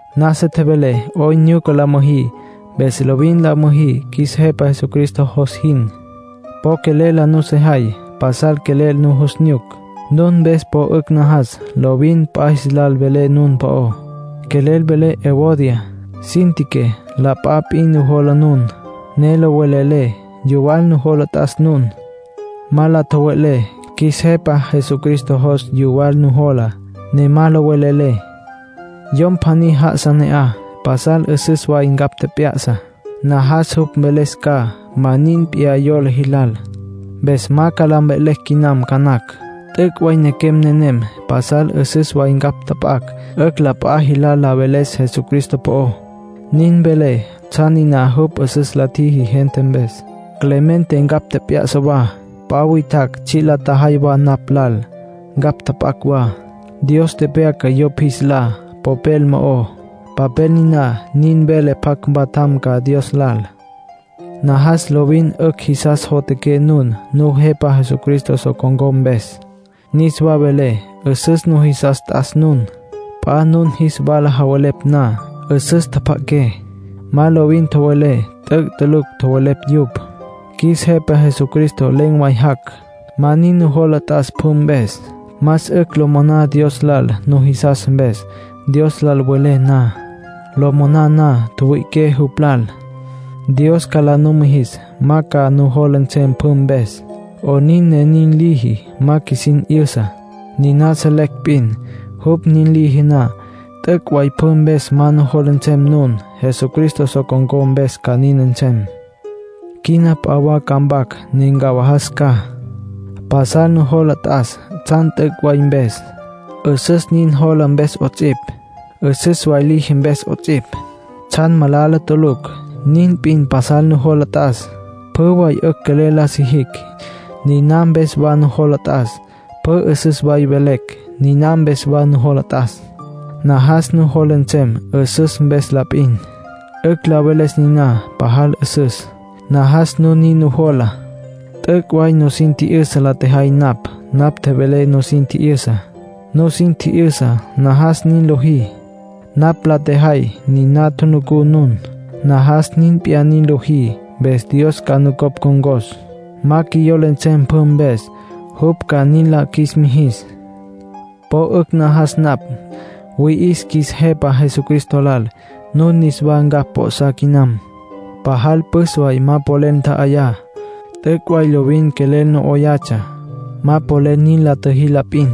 Nasa tjevelé 'oyn nyuca la müjí, mpes lovin la müjí qjuis Jepa Jesucristo jos jin. Po quelel la nusejay. Pasal quelel nujus nyuc. Nun mpes po 'ücj najas. Lovin p'a jilal velé nun po'ó. Quelel velé Evodia, Síntique, la p'a p'in nujola nun, ne lo velelé. Yuwal nujola t'as nun. Ma la tjowe'lé. Qjuis Jepa Jesucristo jos yuwal nujola, ne ma lo velelé. Yom pjaní já'asa ne'aj, pasal 'üsüs way ncapj tjep'ya'sa. Najas jupj mveles ca ma nin p'iyá yola jilal. Mpes ma ca la mve'lecj quinam ca nacj. T'üc' way nequem nenem pasal 'üsüs way ncapj tjap'acj 'ücj la p'a jilal la veles Jesucristo po'ó. Nin velé tsjan niná jupj 'üsüs la tjiji gente mpes. Clemente ncapj tjep'ya'sa wa. P'a witjacj tsji' la tjajay wa napj lal, ncapj tjap'acj wa. Dios tepyaca yupj jis lá papel mo'ó, papel niná nin vele pjac mpatjam ca Dios lal. Najas lovin 'ücj jisas jotjaqué nun Nujepa Jesucristo so con̈có mpes. Niswa velé, 'üsüs nujisas t'as nun. P'a nun jis wala javelepj na, 'üsüs tjapja'aqué. Ma lovin tjowelé t'üc' tulucj tjowelepj yupj. Qjuis Jepa Jesucristo len̈ way jac'. Ma nin nujola t'as pjü mpes. Más 'ücj lo moná Dios lal nujisas mpes, Dios lal welé na. Lo moná na, tjüwüi'iqué jupj lal. Dios ca la numijis ma ca nujola nsem pjü mpes. 'Onin ne nin liji, ma qjuisin 'yüsa. Niná selecj p'in: jupj nin liji na, t'üc' way pjü mpes ma nujola nsem nun. Jesucristo so con̈có mpes ca nin nsem. Quina p'a wa ca mpac, ne ncawajas ca. Pasal nujola t'as tsjan t'üc' way mpes, 'üsüs nin jola mpes 'ots'ipj, 'üsüs way liji mpes 'ots'ipj. Tsjan malala tulucj, nin p'in pasal nujola t'as. Pjü way 'ücj quelel la sijicj, niná mpes wa nujola t'as. Pjü 'üsüs way velecj, niná mpes wa nujola t'as. Najas nujola nsem 'üsüs mpes la p'in. 'Ücj la veles niná pajal 'üsüs, najas nun nin nujola. T'üc' way nusin tji'yüsa la tjejay napj. Napj tjevelé, nusin tji'yüsa. Nusin tji'yüsa, najas nin lojí. Napj la tjejay, niná tjunucú nun. Najas nin p'iyá nin lojí. Mpes Dios ca nucopj ncon̈cos. Ma qjuiyola nsem pjü mpes, jupj ca nin la qjuis mijis. Po 'ücj najas napj. Wüi'is qjuis Jepa Jesucristo lal nun niswa ncapj p'o'sá quinam. Pajal püs way ma polel ntja'ayá. T'üc' way lovin quelel no 'oyatsja; ma polel nin la tjüjí la p'in.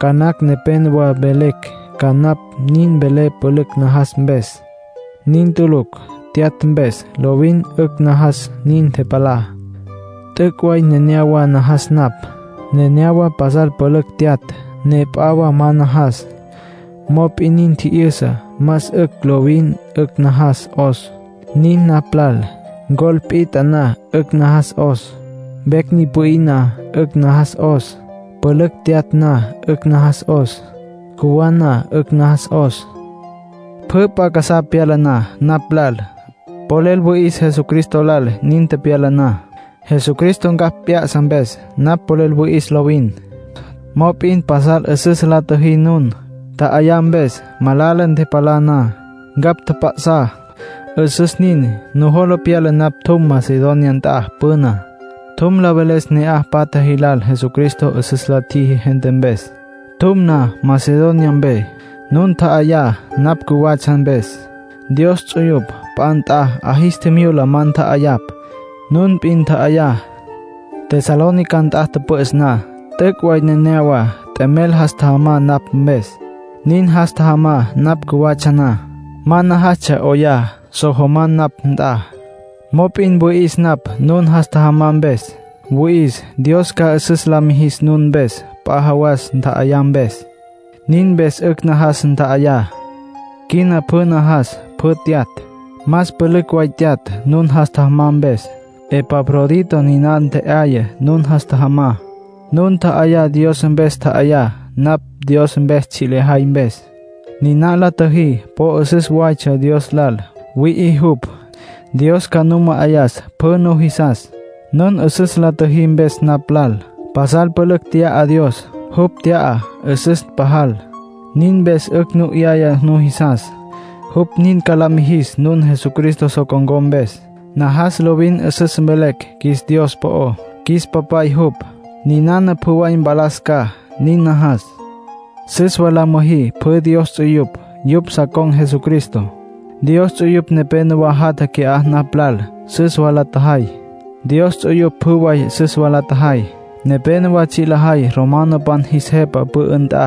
Ca nacj nepénowa mvelecj ca napj nin velé pülücj najas mpes. Nin tulucj. Tyatj mpes, lovin 'ücj najas, nin ntepalá. T'üc' way nenéyawa najas napj. Nenéyawa pasal pülücj tyatj, ne p'a wa ma najas. Mop'in nin tji'yüsa más 'ücj lovin 'ücj najas 'os. Nin napj lal. Ncol pit'a na, 'ücj najas 'os. Vecj ni pü'í na, 'ücj najas 'os. Pülücj tyatj na, 'ücj najas 'os. Cjuwá na, 'ücj najas 'os. Pjü p'a casá pyala na napj lal, polel wüi'is Jesucristo lal nin pyala na. Jesucristo ncapj p'ya'sa mpes, napj polel wüi'is lovin. Mop'in pasal 'üsüs la tjüjí nun, ntja'ayá mpes. Malala ntepalá na, ncapj tjap'a'sá. 'Üsüs nin. Nujola pyala napj tjum Macedonia nt'a püná. Tjum la veles ne'aj patja jilal Jesucristo 'üsüs la tjiji gente mpes. Tjum na Macedonia mpe, nun ntja'ayá napj cjuwatsja mpes. Dios ts'uyupj p'a nt'a 'a jis tjimyula ma ntja'ayapj. Nun p'in ntja'ayá. Tesalónica nt'a tüpü'üs na, t'üc' way nenéyawa t'emel jas tjajamá napj mpes. Nin jas tjajamá napj cjuwatsja na. Ma najastsja 'oyá, so jamá napj nt'a. Mop'in wüi'is napj nun jas tjajamá mpes. Wüi'is Dios ca 'üsüs la mijis nun mpes p'a jawas, ntja'ayá mpes. Nin mpes 'ücj najas ntja'ayá. Quina pjü najas pjü tyatj. Más pülücj way tyatj, nun jas tjajamá mpes. Epafrodito niná ntje'aya nun jas tjajamá. Nun ntja'ayá Dios mpes tja'ayá, napj Dios mpes tsji' lejay mpes. Niná la tjüjí po 'üsüs waytsja Dios lal. Wüi'i jupj. Dios ca nu ma'ayas pjü nujisas, nun 'üsüs la tjüjí mpes napj lal. Pasal pülücj tya'a Dios. Jupj tya'a 'üsüs pajal. Nin mpes 'ücj nu 'yaya nujisas. Jupj nin ca la mijis nun Jesucristo so con̈có mpes. Najas lovin 'üsüs velecj qjuis Dios po'ó. Qjuis Papay jupj. Ninana pjü way mpalas ca, nin najas. Süs wa la müjí pjü Dios ts'uyupj. Yupj sa con̈ Jesucristo. Dios ts'uyupj nepénowa jatja qui'á napj lal. Süs wa la tjajay. Dios ts'uyupj pjü way süs wa la tjajay. Nepénowa tsji' lajay romanopan jis jepa pü'ü nt'a,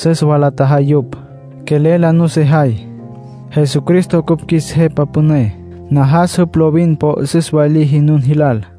süs wa la tjajay yupj. Quelel la nusejay. Jesucristo cupj qjuis Jepa Püné. Najas jupj lovin po 'üsüs way liji nun jilal.